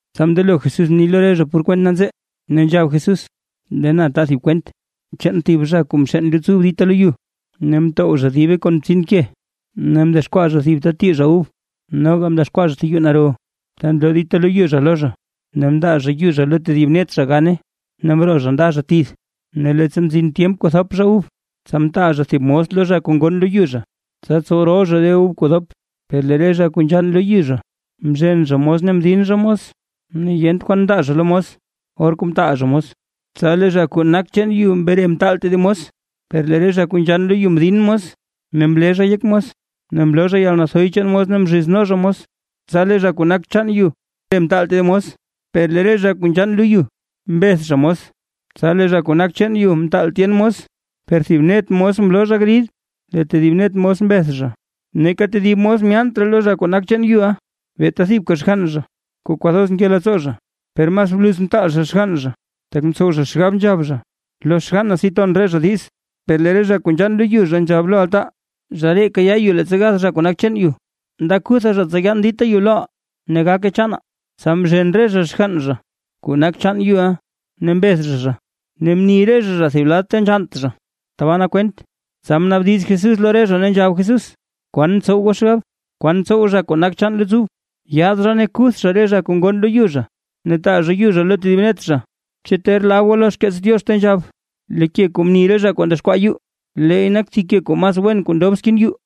Tsa mndelo Jesús mni lo re zha por kwent nanzee, ne nzhab Jesús: ―Lee na ta thib kwent chaan thib zha kuu mxeen luts ub dita lo yu, ne mtow zha dibe kon btsin ke, ne mdexkwaa zha thib ta tii zha ub. Noga mdexkwaa zha thib yuu naro ta nloo dita lo yu zha lo zha. Ne mndaa zha yu zha lo tedib net zha gaane, ne mroo zha nda zha tith. Ne leettsa mzin tyemp kuu thop zha ub, tsa mtaal zha thib mos zha lo re zha kuu ngonn lo yu zha, tsa tsow rol zha re ub kuu dop. Per lee re zha kuu nzhann lo yu zha mzhen zha mos ne mdin zha mos, ne yent kwan mndaa zha lo mos, or kuu mtaal zha mos. Tsa lee zha kuu nak chaan yu mre mtaal tedib mos, per lee re zha kuu nzhann lo yu mdin mos, ne mle zha yek mos, ne mloo zha yalnathoy chaan mos ne mzhizno zha mos. Tsa lee zha kuu nak chaan yu mre mtaal tedib mos, per lee re zha kuu nzhann lo yu mbeth zha mos. Tsa lee zha kuu nak chaan yu mtaal tyen mos, per thib net mos mloo zha grid, lee tedib net mos mbeth zha. ’Neeka tedib mos myaant raa lo zha kuu nak chaan yuʼa, beeta thibka xgann zha, kuu kwathoz nke leettsoo zha. Per mas bluz mtaal zha xgann zha, tak mtsow zha xgab nzhab zha: “Lo xgann na si ton re zha diz”. Per lee re zha kuu nzhann lo yu zha nzhab lo altaa: “Zha ree kayaa yu leettsa gath zha kuu nak chaan yu, nda kuthaa zha tsa yaan dita yu loʼaa, ne gake chaanaa”. Tsa mzhen re zha xgann zha kuu nak chaan yuʼa ne mbeth zha zha, ne mni re zha zha thib lad ta nzhannt zha, tabaa nak kwent. Tsa mnaabdiz Jesús lo re zha, ne nzhab Jesús: ―¿Kwan ntsow goo xgab? ¿Kwan tsow zha kuu nak chaan luts ub? Yaad zha, ne kuth zha re zha kuu ngonn lo yu zha ne taa zha yu zha lo tedib net zha. ’¿Chu ter lab goo lo xkeets Diox? Ta nzhab: Lee ke kuu mni re zha kuu ndexkwaa yuu, leey nak thib ke kuu mas wen kuu ndob skin yuu.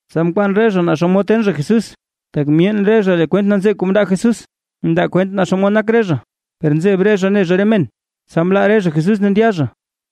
Tsa mkwaan re zha naa xomod ten zha Jesús, tak myeen re zha lee kwent nanzee kuu mndaa Jesús, ndaa kwent naa xomod nak re zha, per nzeb re zha ne zha re men, tsa mlaa re zha Jesús ne ndya zha.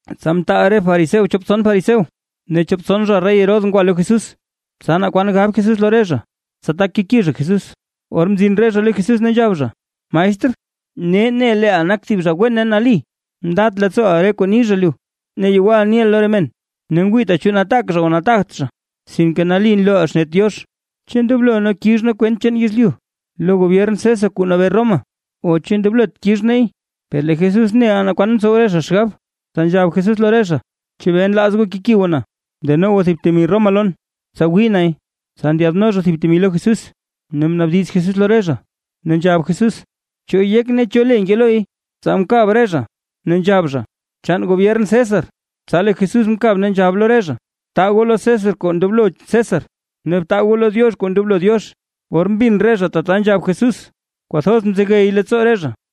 Tsa mtaal re fariseo chop tson fariseo, ne chop tson zha rey Herodes ngwa lo Jesús, tsa naa kwan gab Jesús lo re zha, tsa tak keki zha Jesús. Or mzin re zha lo Jesús ne nzhab zha: ―Maestr, nee ne leeʼa nak thib zha wen ne nali, ndat leettsooʼa re kuu ni zha lu, ne yewal niʼa lo re men, ne ngwiita chu nataak zha o nataagt zha, sinke nali nlooʼa xnet Diox. ¿Chu ndoblo nee kix nee kwent chaan yezlyu lo Gobyern César kuu nabee Roma, o chu ndoblot kix neey? Per lee Jesús neʼa naa kwan ntsow re zha xgab, tsa nzhab Jesús lo re zha: ―¿Chebee nlaaz goo keki goo na? Deno goo thib temi Roma lon, tsa wii nay. Tsa ndyaadno zha thib temi lo Jesús, ne mnaabdiz Jesús lo re zha, ne nzhab Jesús: ―¿Cho yek, ne cho le nke loy? Tsa mkab re zha, ne nzhab zha: ―Chaan gobyern César. Tsa lee Jesús mkab ne nzhab lo re zha: ―Btaa goo lo César kuu ndoblo César, ne btaa goo lo Diox kuu ndoblo Diox. Or mbin re zha tata nzhab Jesús, kwathoz mzegey leettsoo re zha.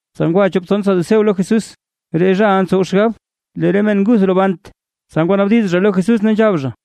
Tsa ngwa chop tson saduceo lo Jesús, re zhaʼa ntsow xgab: “Lee re men nguth robant”. Tsa ngwanaabdiz zha lo Jesús ne nzhab zha: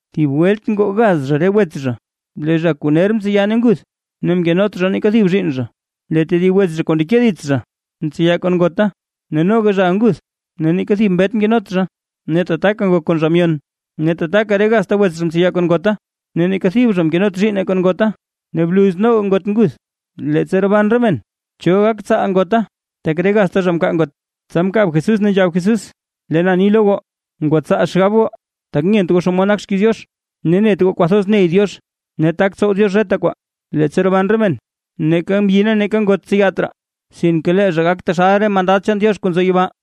Thib welt ngoo gaz zha re wets zha. Lee zha kuu ner mtseya ne nguth, ne mkenot zha neeka thib zhiinn zha. Lee tedib wets zha kuu ndeke dits zha mtseya kon ngota, ne noga zhaʼa nguth ne neeka thib mbet mkenot zha, ne tataka ngok kon zha myon. Ne tataka re gazta wets zha mtseya kon ngota, ne neeka thib zha mkenot zhiinne kon ngota, ne bluz noga ngot nguth. Leettsa roban re men, ¿cho gak tsaal ngota, tak re gazta zha mkaa ngot? Tsa mkab Jesús, ne nzhab Jesús: ―Lee na ni lo goo, ¡ngwatsaa xgab goo! Tak nyent goo xomod nak xkiiz Diox. ¿Chu net goo kwathoz ney Diox ne tak tsow Diox reta kwaa? Leettsa roban re men, neeka mbyi ne neeka ngot tseyat raa, sinke lee zha gak taxal re mandad chaan Diox kuu nzo yibaa.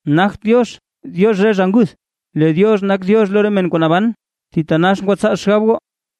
¡Nagt Diox, Diox re zha nguth, lee Diox nak Diox lo re men kuu naban! ¡Thitanax ngwatsaa xgab goo!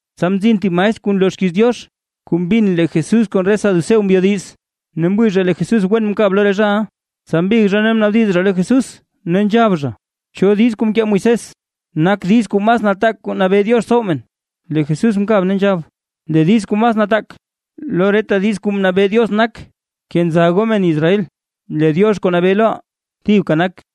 Tsa mzin thib maestr kuu nloo xkiiz Diox, kuu mbin lee Jesús kon re saduceo mbyodiz. Ne mwii zha lee Jesús wen mkab lo re zhaʼa. Tsa mbig zha ne mnaabdiz zha lo Jesús, ne nzhab zha: ―¿Cho diiz kuu mkee Moisés, nak diiz kuu mas nataak kuu mnabee Diox tsow men? Lee Jesús mkab ne nzhab: ―Lee diiz kuu mas nataak lo reta diiz kuu mnabee Diox nak: “Kenza goo men Israel, lee Diox kuu nabee loʼaa thibka nak.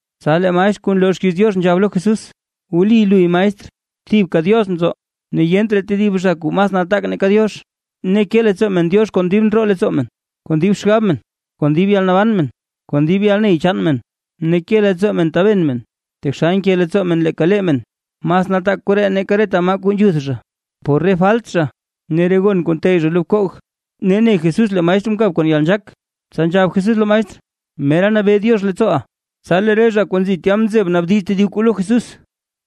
Tsa lee maestr kuu nloo xkiiz Diox nzhab lo Jesús: ―¡Wli luy, maestr! ¡Thibka Diox nzo ne yent raa tedib zha kuu mas nataak nake Diox! Ne ke leettsoo men Diox kon dib ndroo leettsoo men, kon dib xgab men, kon dib yalnaban men, kon dib yalney chaan men ne ke leettsoo men taben men taxal nke leettsoo men leeka lee men. Mas nataak koree nake reta maa kuu nzhuth zha, por re falt zha ne re gon kuu nteyy zha lo bkoog. Ne ne Jesús lee maestr mkab kon yalnzhaak, tsa nzhab Jesús lo maestr: ―Mera nabee Diox leettsooʼa. Tsa lee re zha kuu nzi tya mzeb naabdiz tedib kwaa lo Jesús.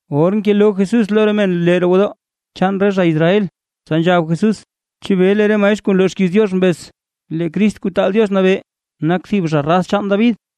Or ngeloo Jesús lo re men lee roo gwodoo chaan re zha Israel, tsa nzhab Jesús: ―¿Chebee lee re maestr kuu nloo xkiiz Diox mbez: “Lee Crist Kuu taal Diox Nabee, nak thib zha raz chaan David”?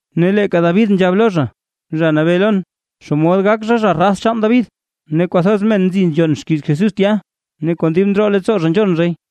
Ne leeka David nzhab lo zha: “Zha Nabee lon”. ¿Xomod gak zha zha raz chaan David? Ne kwathoz men kuu nzi nzhon xkiiz Jesús tya, ne kon dib ndroo leettsoo zha nzhon zhay.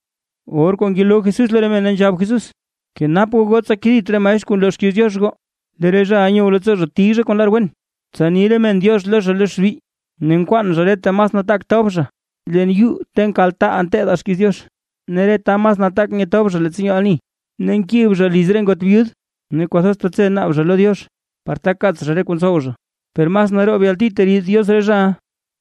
Or kuu ngeloo Jesús lo re men, ne nzhab Jesús: ―Kenap goo goo, tsa kedit re maestr kuu nloo xkiiz Diox goo. Lee re zhaʼa nyow leettsoo zha tiy zha kon lar wen, tsa ni re men “diox” lo zha lo xbi. Ne nkwaan zha re ta mas nataak tob zha leen yuu ta nkaltaaʼaa nteedaa xkiiz Diox, ne re ta mas nataak nyetob zha leettsa nyoo ani, ne nkib zha liz re ngot byud, ne kwathoz tetse naab zha lo Diox, par tak kaats zha re kuu ntsow zha. ¡Per mas naroob yalti teriid Diox re zhaʼa!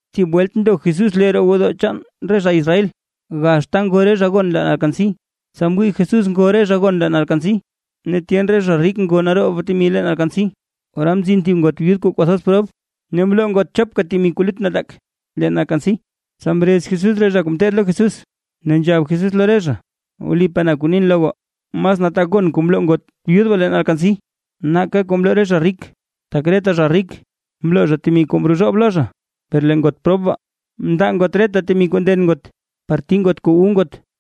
Thib welt ndo Jesús lee roo gwodoo chaan re zha Israel, gax ta ngo re zha gon leen alkansi. Tsa mwii Jesús ngo re zha gon leen alkansi, ne tyen re zha rik ngo naroob temi leen alkansi. Ora mzin thib ngot byud kuu kwathoz prob, ne mloo ngot chopka temi kuu lut nataak leen alkansi. Tsa mrez Jesús re zha kuu ngeteed lo Jesús, ne nzhab Jesús lo re zha: ―Wlipaa na kuu nin lo goo, mas nataak gon kuu mloo ngot byud baa leen alkansi, nake kuu mloo re zha rik. Tak reta zha rik mloo zha temi kuu mrozhoob lo zha, per lee ngot prob baa mndaa ngot reta temi kuu nden ngot, par tii ngot kuu wu ngot.